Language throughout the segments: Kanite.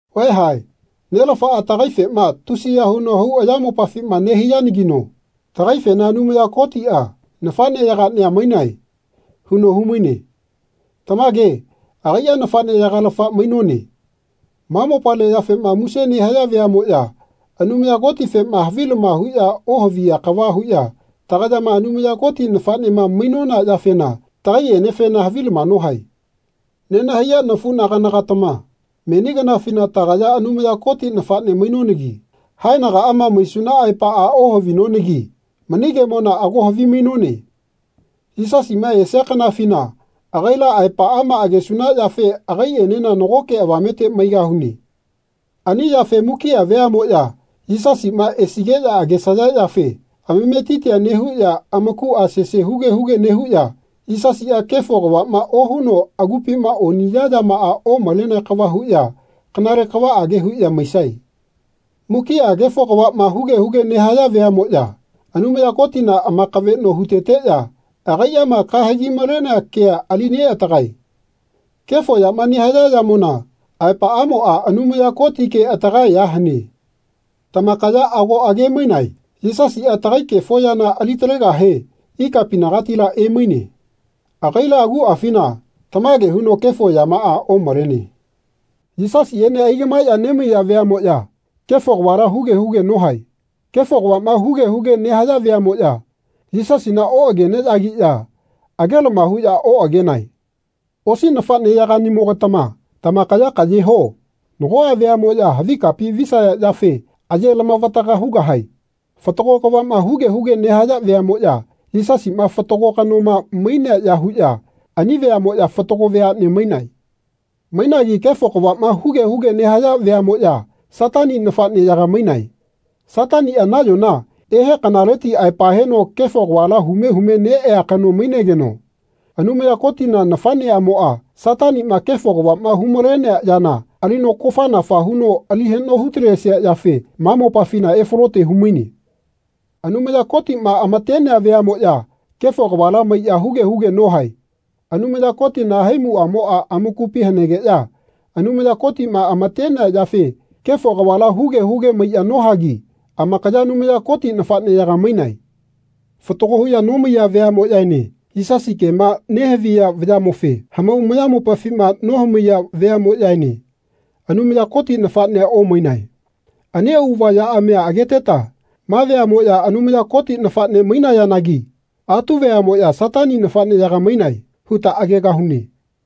Vaeha Nelafaa tagaifema tusiya huno hau ayamopafima nehaiyanagino tagaifena Anumaya Kotia nafaneyagania mainae. huno humaine. Tamage agaia nafaneyagalafa mainone. Ma mopale yafema muse nehaya veamoya Anumaya Kotifema havilama huya ohaviya kava huya tagayama Anumaya Koti nafanema mainona yafena tagaienefena havilama nohae. Nenahaiya nafunagana-gatama meni kanafina tagaya Anumaya Koti nafane mainonagi haenagaama maisuna aepaa ohavinonagi mani kemona ago havimainone. Yisasima esia kanafina agaila aepaama agesuna yafe agaienena nagoke avamete maigahune. Ani yafe mukia veamoya Yisasima esigeya agesaya yafe amametitia nehuya amakua sese huge huge nehuya Yisasia kefo kavama ohuno agupima oniya yama omalenea kava huya kanale kavaage huya maisae. Mukia kefo kavama huge huge nehaya veamoya Anumaya Kotina amakaveno huteteya agaiama kahegi malenea kea ali neatagae. Kefo yama nehaya yamona aepaamoa Anumaya Koti ke atagae ya hane. Tamakaya ago age-mainae Yisasia tagai kefo yana ali talegahe ikapinagatila emaine. Agaila aguafina tamage huno kefo yamaa omalene. Yisasiene aigamaeya nemaiya veamoya kefo kavala huge huge nohae. Kefo kavama huge huge nehaya veamoya Yisasina oageneyagiya agelama huya oagenae. Osi nafaneyaganimoga-tama tamakaya kaye ho. Nagoa veamoya havi kapi visaya yafe aye lamavataga hugahae. Fatago kavama huge huge nehaya veamoya Yisasima fatago kanoma mainea ya huya ani veamoya fatago veane mainae. Mainagi kefo kavama huge huge nehaya veamoya Satani nafaneyaga mainae. Satania nayona ehe kanaleti aepa heno kefo kavala hume hume neea kano mainegeno Anumaya Kotina nafaneamoa Satanima kefo kavama hu-malenea yana alino kofanafa huno ali hano hu-talesia yafe ma mopafina efalote humaine. Anumaya Kotima amatenea veamoya kefo kavala maiya huge huge nohae. Anumaya Kotina haimuamoa amakupi hanegeya Anumaya Kotima amatenea yafe kefo kavala huge huge maiya nohagi amakaya Anumaya Koti nafaneyaga mainae. Fatago huya nomaiya veamoyaene Yisasi kema nehaviya vayamofe hamau ayamopafima nohamaiya veamoyaene Anumaya Koti nafanea omainae. Ani auava yaamia ageteta Ma veamoya Anumaya Koti nafane mainayanagi atu veamoya Satani nafaneyaga mainae. huta agegahune.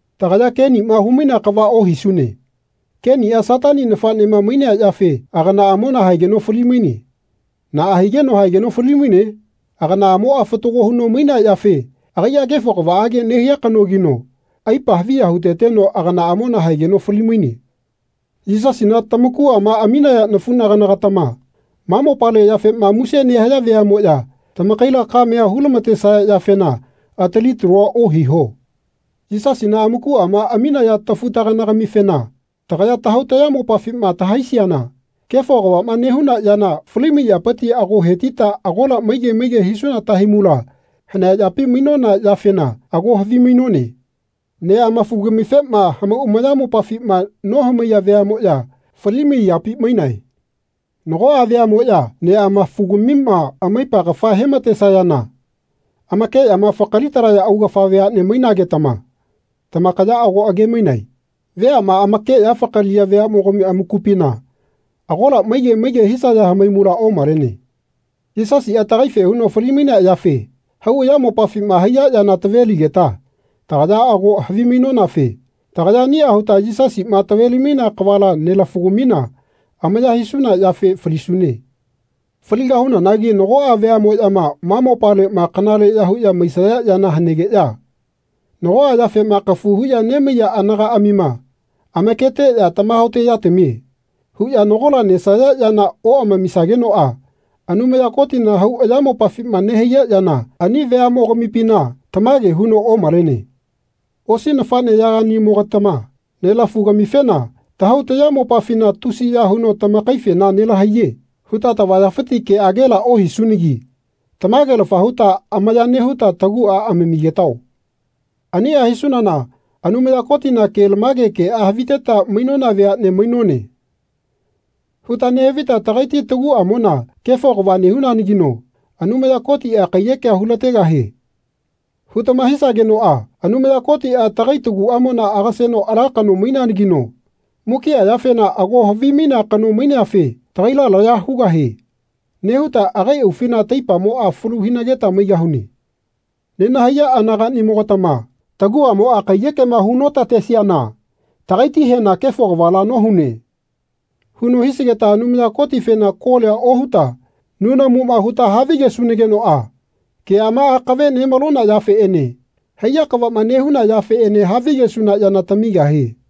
Tagaya Kenima humainea kava ohisune. Kenia Satani nafanema mainea yafe aganaamona haegeno fali-maine. Naa higeno haegeno fali-maine? Aganaamoa fatago huno mainea yafe agaia kefo kavaage nehia kanogino aipa haviya huteteno aganaamona haegeno fali-maine. Yisasina tamakuama aminaya nafunagana-gatama ma mopale yafema muse nehaya veamoya tamakaila kamea hu-lamatesaya yafena atali talua ohiho. Yisasina amukuama aminaya tafu-tagana-gamifena tagaya tahau tayamopafima tahaisiana kefo kavama nehuna yana falimai yapiti ago hetita agola maige maige hisuna tahaimula hanea yapi mainona yafena ago havimainone. Neamafu-gamifema hamau amayamopafima nohamaiya veamoya falimai yapi mainae. Nagoa veamoya neamafugamima amaipa kafa hematesayana amakeyama fakaliya augafa veane mainagetama tamakaya ago age-mainae. Veama amakeya fakaliya veamogami amakupina agola maige maige hisaya hamaimula omalene. Yisasia tagaife huno fali-mainea yafe hau ayamopafima haiya yana taveligeta tagaya ago havimainonafe tagaya ania huta Yisasima taveli-mainea kavala nelafu-gamina amaya hisuna yafe falisune. Faligahunanagi nagoa veamoyama ma mopalema kanaleya huya maisaya yana hanegeya nagoa yafema kafu huya nemaiya anagaamima amaketeya Tamahaote yatamie. huya nagola nesaya yana oamamisagenoa Anumaya Kotina hau ayamopafima nehaiya yana ani veamogamipina tamage huno omalene. Osi nafaneyaganimo-gatama nelafu-gamifena tahau tayamopafina Tusiya huno tamakaifena nelahaiye. huta tavayafiti keagela ohisunagi tamagelafa huta amaya nehuta tagua amamigetao. Ania hisunana Anumaya Kotina kelamage kea haviteta mainona veane mainone. huta nehavita tagaiti taguamona Kefo kava nehunanagino Anumaya Kotia kaiyeke hulategahie. hutama hisagenoa Anumaya Kotia tagai taguamona agaseno ala kano maineanagino mukia yafena ago havimainea kano maineafe Tagaila laya hugahie. nehuta agai aufina taipamoa falu hinageta maigahune. Nenahaiya anaganimo-gatama taguamoa kaiyekema hu notatesiana tagaitihena Kefo kavala nohune. huno hisigeta Anumaya Kotifena kolia ohuta nunamuma huta havigesunagenoa keama akave nemalona yafeene haiya kavama nehuna yafeene havigesuna yana tamigahie.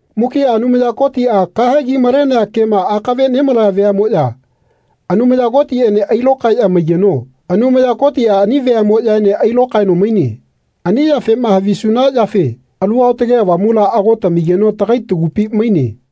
Mukia Anumaya Kotia kahegi malenea kema akave nemalaya veamoya Anumaya Kotiene ailokaeya maigeno Anumaya Kotia ani veamoyaene ailokaeno maine. Ani yafema havisuna yafe Alu Aotage Avamula ago tamigeno tagai tagupi maine.